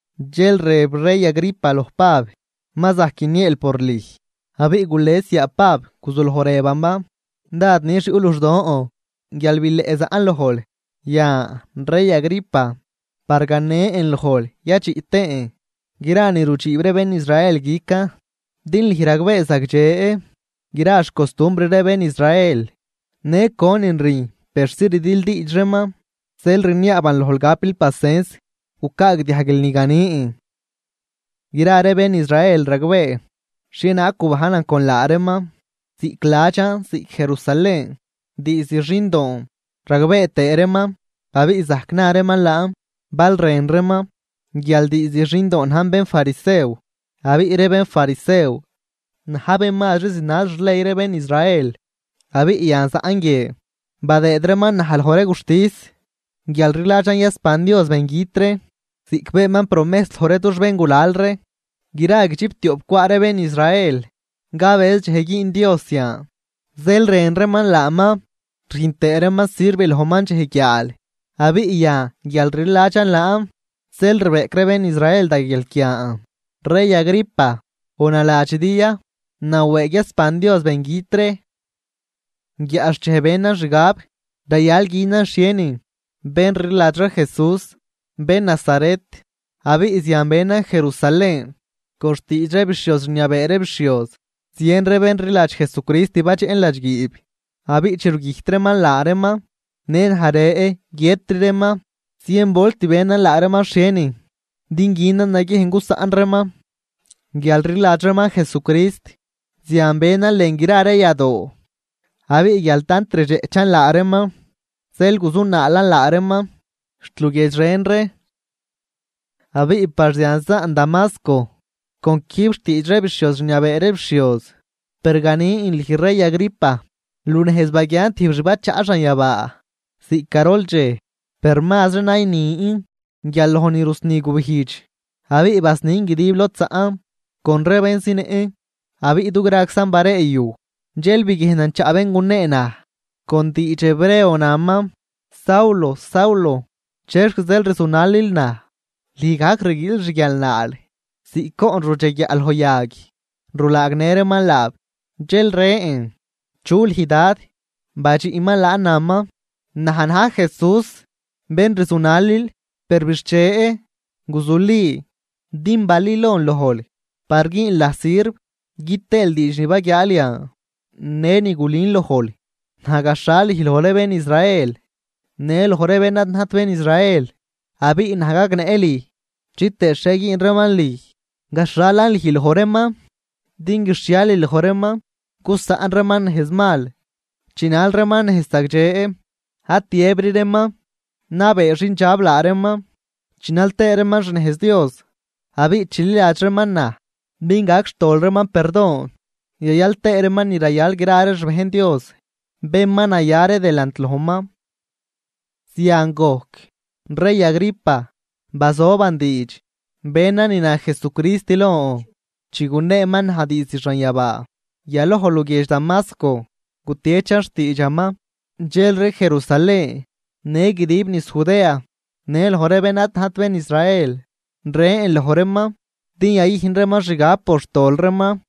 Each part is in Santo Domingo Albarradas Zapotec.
Dxel rëb rey Agripa loj Pab: ―Ma zajc guinieel por lüj. Abiꞌ gules yaa Pab guzuloj rëbaman: ―Dád nix yuꞌ luxdon guial bileꞌ zaꞌn lojl yan rey Agripa, par ganen lojl yadxiꞌ tëën gra ni rudxiib ree bén Israel guican. Din lüj ragbee zagdxe gra xcostumbr ree bén Israel, në conin rüjn persi rdildiidx reeman. Zeel rniaaban lojl gapil pasens gucaagdiajguil ni ganin. ’Gra ree bén Israel ragbee xhienaag gubajnan con laa reeman ziꞌc ladxan ziꞌc Jerusalén, diizd xindoon. Ragbee tëë reeman abiꞌ zajc na reeman laan bal rën reeman, guial diizd xindoon najn bénfarisew, abiꞌ ree bénfarisew na̱j bén mazri zinal xley ree bén Israel. Abiꞌ yan zaꞌn guie, badëëd reeman naj loj ree guxtis guial rliladxan yasban Dios bengüt ree ziꞌc beenman promejs loj ree dux béngulal ree. Gra guidxiptioꞌp cwaꞌ ree bén Israel cabëz dxej güün Dios zian, zeel rën reeman laaman rüjn tëë reeman sirv lojman dxej guiaal. Abiꞌ yan guial rliladxan laan zeel rbeꞌc ree bén Israel da guialquian, rey Agripa. ¿O naladxidi ya nawëëg yasban Dios bengüt ree? ’Guiaꞌxchej benan xgab rayal günan xhienin bén rliladx ree Jesús, bén Nazaret, abiꞌ zian benan Jerusalén. Con xtiidx ree bixhioz rniabee ree bixhioz, zien ree bén rliladx Jesucrist badxeꞌn ladxguiib. Abiꞌ chi rugüjt reeman laa reeman, në naj rë guiëtri reeman. Zien volt benan laa reeman xhienin din günan naguiejn gusaꞌn reeman guialrliladx reeman Jesucrist. Zian benan lën gra ree yadoo, abiꞌ guial tant rdxeꞌchan laa reeman dxel guzunaalan laa reeman xt luguiedx ren ree. ’Abiꞌ par zian zaꞌn Damasco, con quijb xtiidx ree bixhioz rniabee ree bixhioz. Per ganin lüj rey Agripa, lunejz baguian tijb xbachaꞌ xanyabaa ziꞌc garol dxej, per mazri naynin guial loj ni rusni gubijdx, abiꞌ basnin guidib lod zaꞌn con ree bén zinëꞌn. Abiꞌ dugraczan bareeyuj, dxel biguiejnan chaꞌ bén gunee naj con diidx hebreo, naman: “Saulo, Saulo, ¿chexc zeel rzunalil naj? Lüj gajc rguiil xguialnaal ziꞌc goꞌn rudxeguiaꞌ loj yag rulaagnë reeman laab.” Dxel rën: “¿Chu lüj Dad?” Badxiꞌman laan naman: “Naj na̱j Jesús bén rzunalil. Per bixche, guzuli, din balülon lojl par güünl naj sirv gü tëël diidx ni baguiaal yan në ni gulün lojl. Naj gaxhal lüj loj ree bén Israel në loj ree bén ad najt bén Israel, abiꞌ naj gagnëꞌ lüj chitëë xhie güün reeman lüj. Gaxhalan lüj loj reeman din guixhialil loj reeman gusaꞌn reeman nejz mal, chinal reeman nejz zagdxe. Ad tiëbri reeman nabee xindxab laa reeman, chinal tëë reeman xnejz Dios. Abiꞌ chililadx reeman naj din gac xtol reeman perdon yayal tëë reeman ni rayal gra ree xbejn Dios, bén ma naya ree delant lojman.” ’Zian gojc, rey Agripa, bazoban diidx benan ni na Jesucrist lon chi guneeman naj diizd xanyabaa. Yaloj luguiedx Damasco gutiechan xtiidxaman, dxelri Jerusalén në guidib niz Judea në loj ree bén ad najt bén Israel. Rën loj reeman din yayüjn reeman xgab por xtol reeman,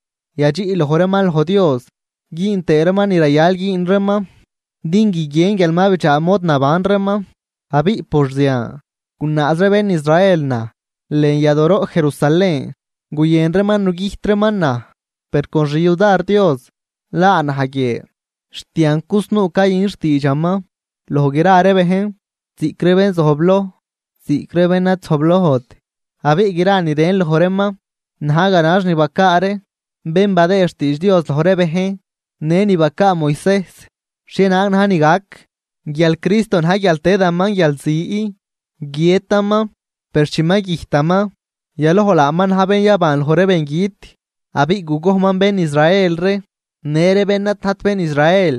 yadxiꞌ loj reeman loj Dios güün tëë reeman ni rayal güün reeman din guiguien guial ma bidxaa mod naban reeman. Abiꞌ por zian, gunaaz ree bén Israel naj lën yadooroꞌ Jerusalén, guyën reeman nugüjt reeman naj. Per con xyudar Dios laa naj guie xt yan cusnuu cayün xtiidxaman loj gra ree bejn, ziꞌc ree bén zojbloj ziꞌc ree bén ad zojblojt. Abiꞌ gra ni rën loj reeman na̱j ganax ni bacaa ree bén badëë xtiidx Dios loj ree bejn në ni bacaa Moisejs xhienaag na̱j ni gac, guial Cristo na̱j guial tëdaman guialzi, guiëtaman. Per chi ma güjtaman yaloj laaman na̱j bén yaban loj ree bengüt, abiꞌ gugojnman bén Israel ree në ree bén ad najt bén Israel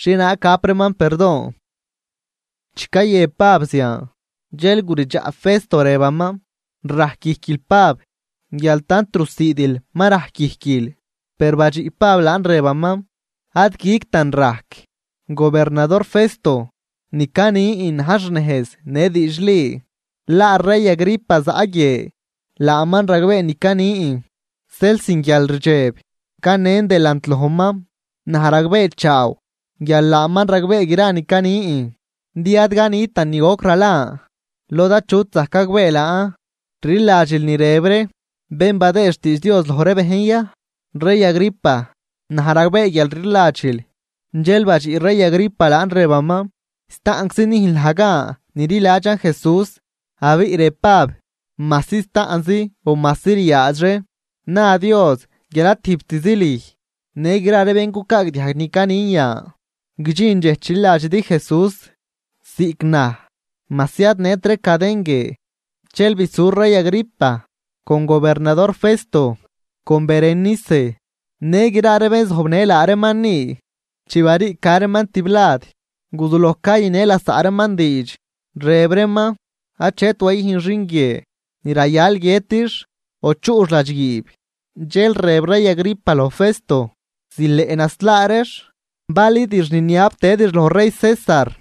xhienaag gap reeman perdon. Chi cayëb Pab zian, dxel gudidxaꞌ Festo rëbaman: ―¡Rajcguijquil Pab! guial tant rusiidil ma rajc guijquil. Per badxiꞌ Pab laan rëbaman: ―Ad guictan rajc, gobernador Festo. Ni canin najn xnejz në diidxli. Laa rey Agripa zaꞌ guie, laaman ragbee ni canin, zeel sin guialrdxeb canen delant lojman. Naj ragbeechaaw guial laaman ragbee gra ni canin, din ad canitan ni goc ralan lod achut zajc gagbee laan. ¿Rliladxil ni rëb ree bén badëëd xtiidx Dios loj ree bejn ya, rey Agripa? Naj ragbee guial rliladxil. Dxel badxiꞌ rey Agripa laan rëbaman: ―Staꞌnczi nüjnl naj gan nililadxan Jesús. Abiꞌ rëb Pab: ―Majsi staꞌnz o majsi ryaadxri, na Dios guial ad tijbtzi lüj, në gra ree bén cucaagdiajg ni canin yan, guidxin dxej chililadxidi Jesús ziꞌc naj, majsi ad nët ree caden guie. Dxel bisu rey Agripa con gobernador Festo con Berenice në gra ree bén zojbnë laa reeman ni. Chi bariica reeman tiblad guzuloj cayünë lasaꞌ reeman diidx, rëb reeman: ―Achet wayüjn xin guie ni rayal guiëtix, o chuꞌx ladxguiib. Dxel rëb rey Agripa loj Festo: ―Zileꞌ naslaa reex, balidix niniab tëdix loj rey César.